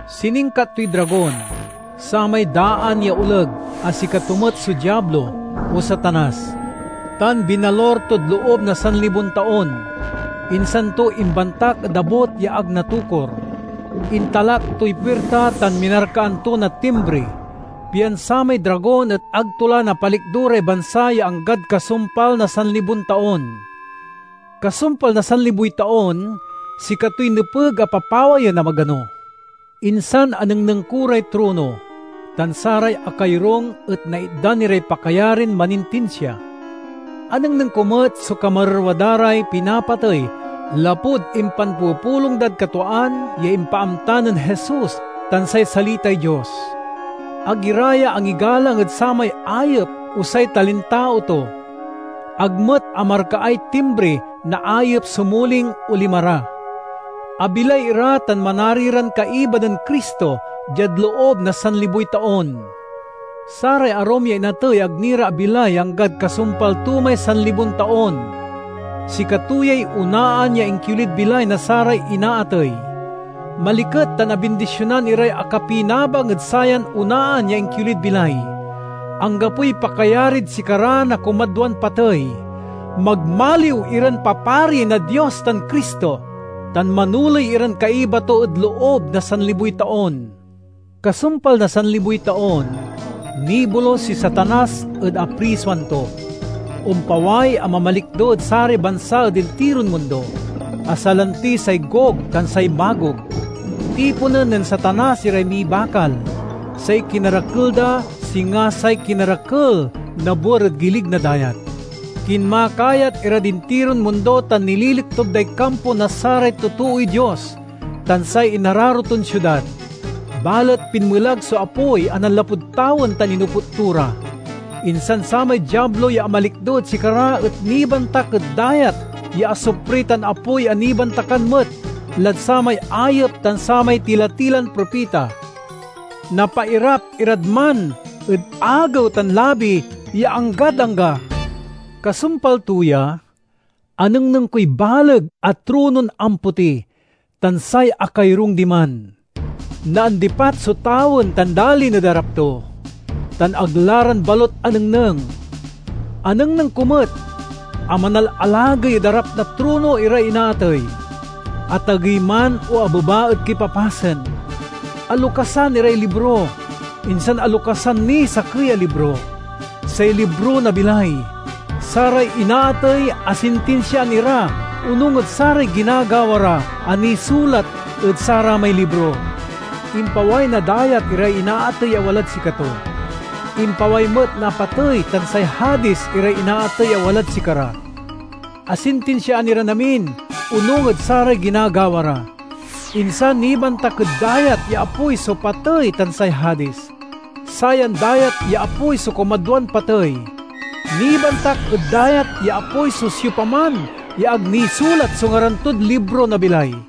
Siningkat toy dragon, samay daan ya oleg a sikato met so Diablo, o Satanas, tan binalur tod loob na sanlibon taon. Insan to imbantak ed abut ya ag natokur, intalak toy puirta tan minarkaan to na timbri, pian samay dragon et ag to la napalikdo ray bansa ya anggad kasumpal na sanlibon taon. Kasumpal na sanliboy taon, sikatoy nepeg a papawayen a magano. Insan anengneng ko ray trono, tan saray akayorung et naitdan iray pakayarin manintinsia. Anengneng ko met so kamarerwa da ray pinapatey lapud impanpupulong dad katwaan ya impaamta nen Jesus tan say salitay Dios. Ag ira ya angigalang ed samay ayep o say talintao to; ag met amarkaay timbri na ayep so muling o lima ra. Abilay ira tan manari ran kaiba nen Cristo diad loob na sanliboy taon. (Saray arum ya inatey ag ni ra abilay ya anggad kasumpal to may sanlibon taon.) Sikato yay onaan ya inkiolid bilay na saray inaatey. Maliket tan abindisionan iray akapinabang ed sayan onaan ya inkiolid bilay. Anggapoy pakayarid sikara na kumadwan patey. Magmaliw iran papari na Dios tan Cristo, tan manoley iran kaiba to ed loob na sanliboy taon. Kasumpal na sanliboy taon, nibolus si Satanas ed aprisoan to. Ompaway a mamalikdo ed saray bansa ed intiron mundo, a salanti say Gog tan say Magog. Tiponen nen Satanas iray mibakal. Say kinarakel da singa say kinarakel na buer ed gilig na dayat. Kinmakayat irad intiron mundo tan nililiktub day kampo na saray totooy Dios tan say inararo ton siudad. Balet pinmelag so apoy a nanlapud tawen tan inoput to ra. Insan samay Diablo ya amalikdo ed sikara et nibantak ed dayat ya asupri tan apoy a nibantakan met lad samay ayep tan samay tila-tilan propita. Napairap irad man ed agew tan labi ya anggad angga. Kasumpal to ya, anengneng koy baleg a tronon ampoti tan say akayorung diman. Naandipat so tawen tan dalin ed arap to, tan ag la ran balut anengneng. Anengneng ko met a manalalagey ed arap na trono iray inaatey, atagey man o abeba ed kipapasen. Alokasan iray libro, insan alokasan niy sakey a libro—say libro na bilay. Saray inaatey asintinsiaan ira onung ed saray ginagawa ra a nisulat ed saramay libro. Impaway na dayat iray inaatey a walad sikato. Impaway met na patey tan say Hadis iray inaatey a walad sikara. Asintinsiaan iran amin, onung ed saray ginagawa ra. Insan nibantak ed dayat ya apoy so patey tan say Hadis. (Sayan dayat ya apoy so kumadwan patey.) Nibantak ed dayat ya apoy so siopaman ya ag nisulat so ngaran tod libro na bilay.